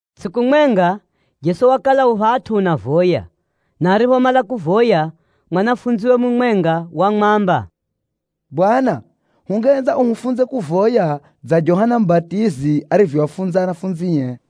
Tsʼiku mwenga, Jeso wakala u phatʼu unavoya, na ariphomala kuvoya, mwanafunziwe mumwenga wamwamba, “Bwana, hungehenza uhufunze kuvoya dza Johana Mubatizi arivyoafunza anafunzie.”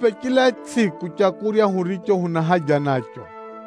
Hupʼe chila tsʼiku leu huriro huna haja naro,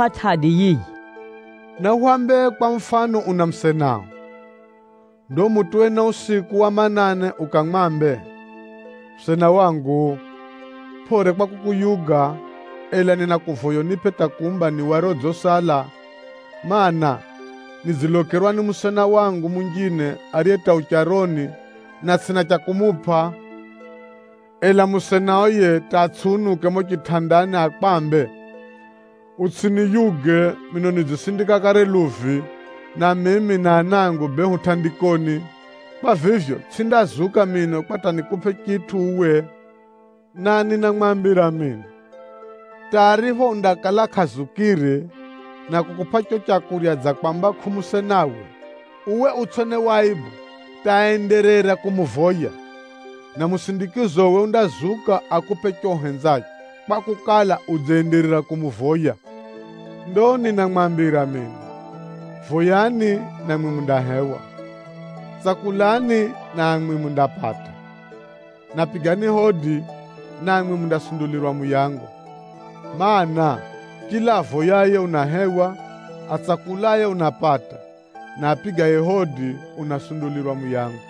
Chisha achiapʼa tʼadi yiyi, “Nahwambe kwa mufano una musenao. Ndo umutuwe na usiku wa manane ukamwambe, ‘Musena wangu, pʼore kwa kukuyuga, ela ninakuvoya unipʼe hata kumba ni wari odzisala, mana, nidzilokerwa ni musena wangu munjine ariye hata u charoni, na tsʼina cha kumupʼa.’ Ela musenao yiye hata atsʼiunuke mumo chitʼandani akwambe, ‘Utsʼiniyuge! Mino nidzisindika kare luvi, na mimi na anangu bee hu tʼandikoni. Kwa vivyo, tsʼindazuka mino kwa hata nikupʼe chitʼu uwe!’ Na ninamwambira mino, hata aripho undakala kʼazukire na kukupʼa riro leu dza kwamba kʼu musenawe, uwe utsʼone waibu hata áenderera kumuvoya, na musindikizowe undazuka akupʼe chicho uhenzacho, kwakukala, udzenderera kumuvoya. Ndo ninamwambira mino, voyani, namwi mundahewa, tsakulani, namwi mundapata, na pigani hodi, namwi mundasundulirwa muyango. Maana, chila avoyaye unahewa, atsakulaye unapata, na apigaye hodi unasundulirwa muyango.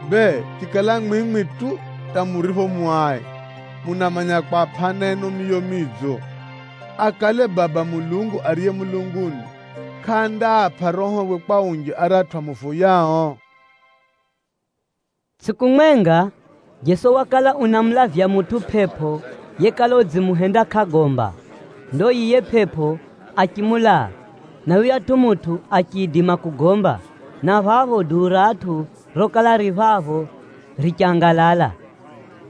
Bee, chikala mwimwi tu hata muripho mu ai, ela munamanya kwapʼa ana enu miyo midzo, akale Baba Mulungu ariye mulunguni kʼandaapʼa Rohowe kwa unji aratʼu amuvoyao?” Tsʼiku mwenga, Jeso wakala unamulavya mutʼu pʼepʼo yekala udzimuhenda kʼagomba. Ndo yiye pʼepʼo achimulaa, na yuyatʼu mutʼu achiidima kugomba, na phapho duu ra atʼu rokala ririro phapho richangalala.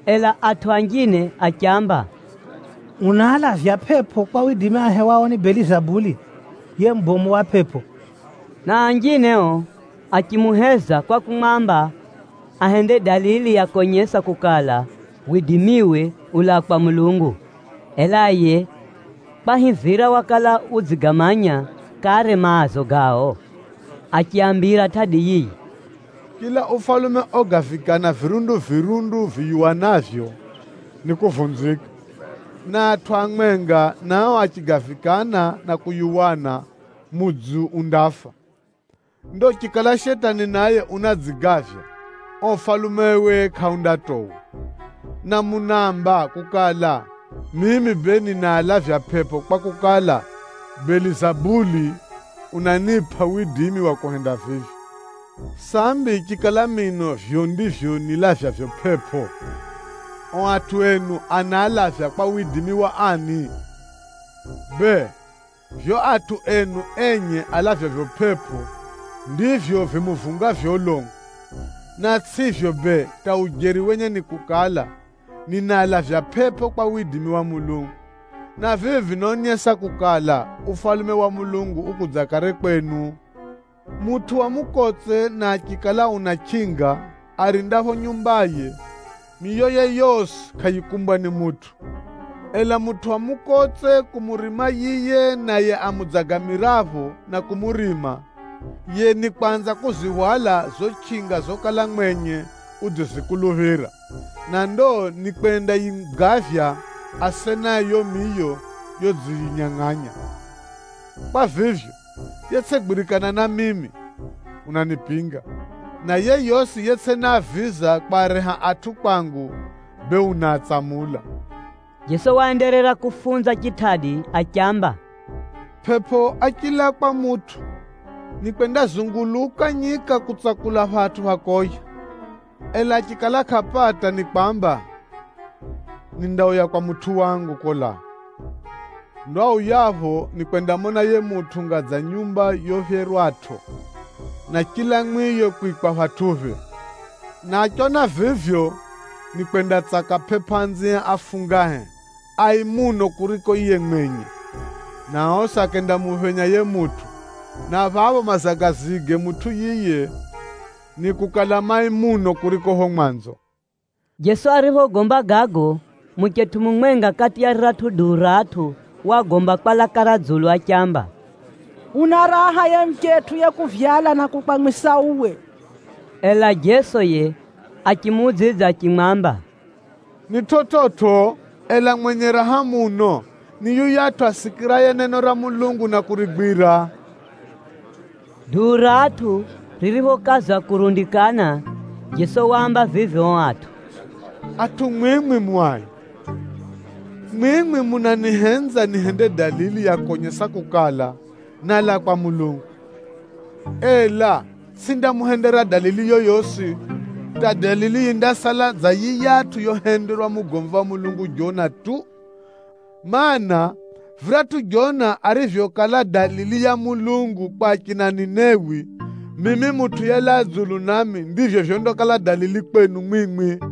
Ela atʼu anjine achiamba, “Unaalavya pʼepʼo kwa widimi ahewao ni Belizabuli, yiye mubomu wa pʼepʼo,” na anjine ao, achimuheza kwa kumwamba ahende dalili ya konyesa kukala, widimiwe ulaa kwa Mulungu. Ela yiye kwahivira wakala udzigamanya kare maazo gao, achiaambira tʼadi yiyi, “Chila ufalume ogavikana virundu-virundu viyuwanavyo, nikuvunzika, na atʼu amwenga nao achigavikana na kuyuwana, mudzi undafa. Ndo chikala Shetani naye unadzigavya, uo ufalumewe kʼaundatowa. Na munaamba kukala, mimi bee ninaalavya pʼepʼo, kwakukala, Belizabuli unanipʼa widimi wa kuhenda vivyo. Sambi chikala mino vivyo ndivyo nilavyavyo pʼepʼo, ao atʼu enu anaalavya kwa widimi wa ani? Bee, vivyo atʼu enu enye alavyavyo pʼepʼo, ndivyo vimuvungavyo ulongo. Na tsʼivyo bee hata ujeri wenye ni kukala, ninaalavya pʼepʼo kwa widimi wa Mulungu, na vivi vinaonyesa kukala, Ufalume wa Mulungu ukudza kare kwenu. “Mutʼu wa mukotse na achikala una chʼinga, arindapho nyumbaye, miyoye yosi kʼayikumbwa ni mutʼu. Ela mutʼu wa mukotse kumurima yiye naye amudzagamirapho na kumurima, yiye nikwanza kuzihwala zizo chʼinga zokala mwenye udzizikuluphira, na ndo nikwendayigavya asenae yiyo miyo yodziyinyangʼanya. Kwa vivyo, yetsʼigwirikana na mimi, unanipinga, na yeyosi yetsʼinaaviza kwareha atʼu kwangu, bee unaatsamula.” Jeso waenderera kufunza chitʼadi achiamba, “Pʼepʼo achilaa kwa mutʼu, nikwendazunguluka nyika kutsakula phatʼu pha koya, ela achikala kʼapata nikwamba, ‘Nindauya kwa mutʼu wangu kolaa.’ Ndo auyapho nikwendamona yiye mutʼu unga dza nyumba yophyerwatʼo, na chila mwiyo kwikwa phatʼuphe. Na achiona vivyo, nikwendatsaka pʼepʼo anzie afungahe, ai muno kuriko yiye mwenye, na osi akendamuphenya yiye mutʼu. Na phapho mazagazige mutʼu yiye nikukala mai muno kuriko phapho mwanzo.” Jeso ariphogomba gago, muchetʼu mumwenga kati ya riratʼu duu ra atʼu wagomba kwa laka ra dzulu achiamba, “Una raha yiye muchetʼu yekuvyala na kukwamwisa uwe!” Ela Jeso yiye achimuudzidza achimwamba, “Ni chividzo, ela mwenye raha muno ni yuyatʼu asikiraye neno ra Mulungu na kurigwira.” Duu ra atʼu ririphokaza kurundikana, Jeso waamba vivi ao atʼu, “Atʼu mwimwi mu ai. Mwimwi munanihenza nihende dalili ya konyesa kukala, nálaa kwa Mulungu, ela tsʼindamuhendera dalili yoyosi, hata dalili yindasala dza yiyatʼu yohenderwa mugomvi wa Mulungu Jona tu. Maana, viratʼu Jona arivyokala dalili ya Mulungu kwa achina Ninewi, mimi Mutʼu yelaa dzulu nami ndivyo vyondakala dalili kwenu mwimwi.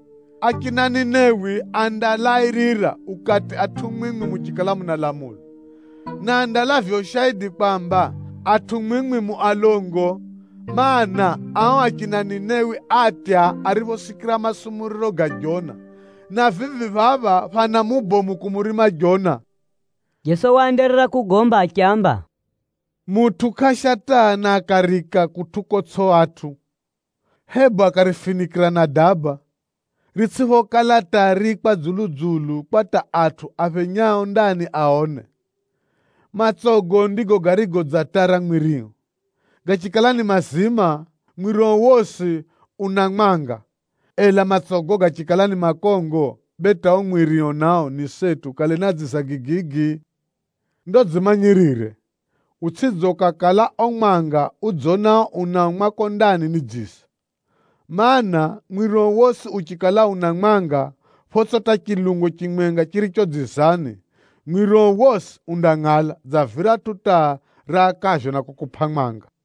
Achina Ninewi andalairira ukati atʼu mwimwi muchikala munalamulwa, na andalavya ushaidi kwamba, atʼu mwimwi mu alongo! Maana, ao achina Ninewi átya ariphosikira masumuriro ga Jona, na vivi phapha, phana mubomu kumurima Jona!” Jeso waenderera kwaambira chitʼadi achiamba, “Mutʼu kʼaasha taa na akariika kutʼu kotsʼi atʼu, hebu akarifinikʼira na daba, ritsʼiphokala taa riikwa dzulu-dzulu kwa hata atʼu aphenyao ndani aone. Matsogo ndigo garigo dza taa ra mwirio. Gachikala ni mazima, mwirio wosi una mwanga, ela matsogo gachikala ni makongo, bee hata uo mwirio nao ni seti ukale na dziza gigigi. Ndo dzimanyirire, utsʼidze ukakala uo mwanga udzonao unao mwako ndani ni dziza. Maana, mwirio wosi uchikala una mwanga photsʼi hata chilungo chimwenga chiricho dzizani, mwirio wosi undangʼala dza viratʼu taa rakavyo na kukupʼa mwanga.”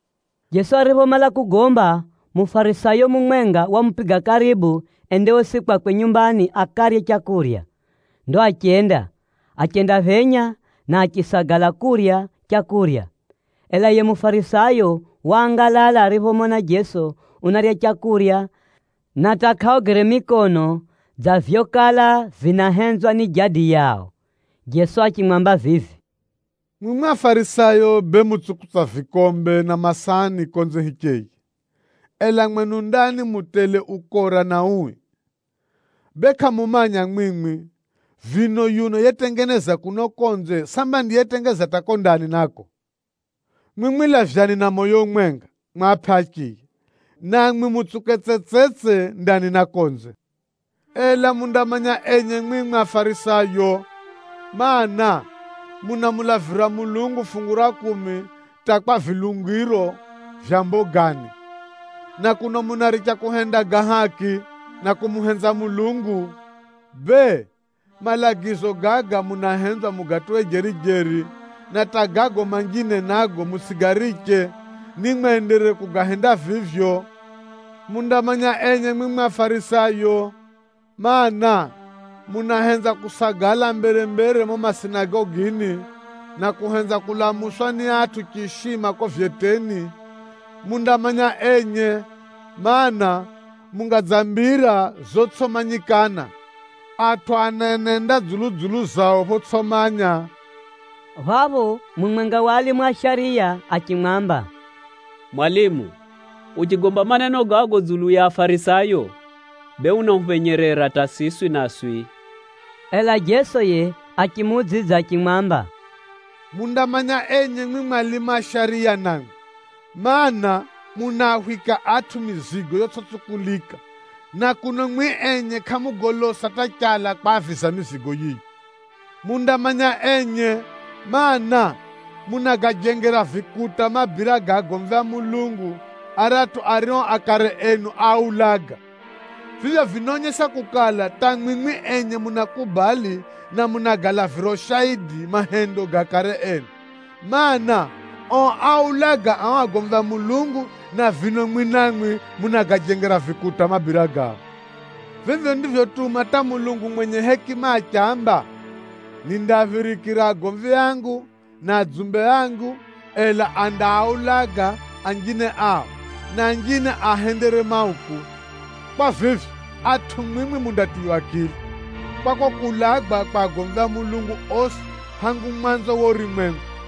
Jeso ariphomala kugomba, Mufarisayo mumwenga wamupiga karibu ende osi kwakwe nyumbani akarye leu. Ndo achenda, achendaphenya na achisagala kurya leu. Ela yiye Mufarisayo waangalala ariphomona Jeso unarya leu na hata kʼaogere mikono dza vyokala vinahenzwa ni jadi yao. Jeso achimwamba vivi, “Mwimwi Afarisayo bee mutsukutsa vikombe na masahani konze hicheye, ela mwenu ndani mu tele ukora na ui. Bee kʼamumanya mwimwi! Vino yuno yetengeza kuno konze samba ndiye yetengeza hata kuko ndani nako? Mwimwi lavyani na moyo umwenga mwapʼe achiya, namwi mutsuke tsetsetse ndani na konze. “Ela mundamanya enye mwimwi Afarisayo, mana, munamulavira Mulungu fungu ra kumi hata kwa vilungiro vya mbogani, na kuno munaricha kuhenda ga haki, na kumuhenza Mulungu. Bee, malagizo gaga munahenzwa mugatuwe jeri-jeri, na hata gago manjine nago mutsʼigariche, nimwenderere kugahenda vivyo. “Mundamanya enye mwimwi Afarisayo, mana, munahenza kusagala mbere-mbere mumo masinagogini, na kuhenza kulamuswa ni atʼu chiishima kuko vyeteni. Mundamanya enye, mana, munga dza mbira zotsʼimanyikana, atʼu anenenda dzulu-dzulu yao photsʼimanya.” Phapho mumwenga wa alimu a shariya achimwamba, “Mwalimu, uchigomba maneno gago dzulu ya Afarisayo, bee unahuphenyerera hata siswi naswi.” Ela Jeso yiye achimuudzidza achimwamba, “Mundamanya enye mwimwi alimu a shariya namwi, mana, munaahwika atʼu mizigo yotsʼitsukulika na kuno mwimwi enye kʼamugolosa hata chala kwaaviza mizigo yiyo. Mundamanya enye, mana, munagajengera vikuta mabira ga agomvi a Mulungu aratʼu ario akare enu áaulaga. Vivyo vinaonyesa kukala, hata mwimwi enye munakubali na munagalavira ushaidi mahendo ga akare enu. Maana, ao áaulaga ao agomvi a Mulungu, na vino mwimwi namwi munagajengera vikuta mabira gao. Vivyo ndivyotuma hata Mulungu mwenye hekima achiamba, ‘Nindaaphirikira agomvi angu na ahumwa angu, ela andaaulaga anjine ao, na anjine aahendere mauku.’ Kwa vivyo, atʼu mwimwi mundatiywa akili kwa kuulagwa kwa agomvi a Mulungu osi hangu mwanzo wa urumwengu,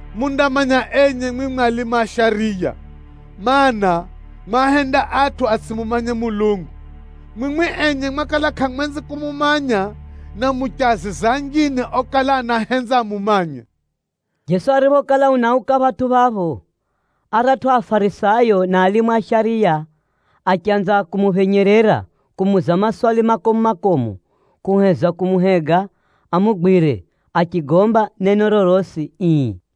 “Mundamanya enye mwimwi alimu a shariya, mana, mu ahenda atʼu atsʼimumanye Mulungu. Mwimwi enye mwakala kʼamwenzi kumumanya, na muchiaziza anjine okala anahenza amumanye!” Jeso ariphokala unauka phatʼu phapho, aratʼu Afarisayo na alimu a shariya achanza kumuphenyerera kumuuza maswali makomu-makomu, kuheza kumuhega amugwire achigomba neno rorosi ii.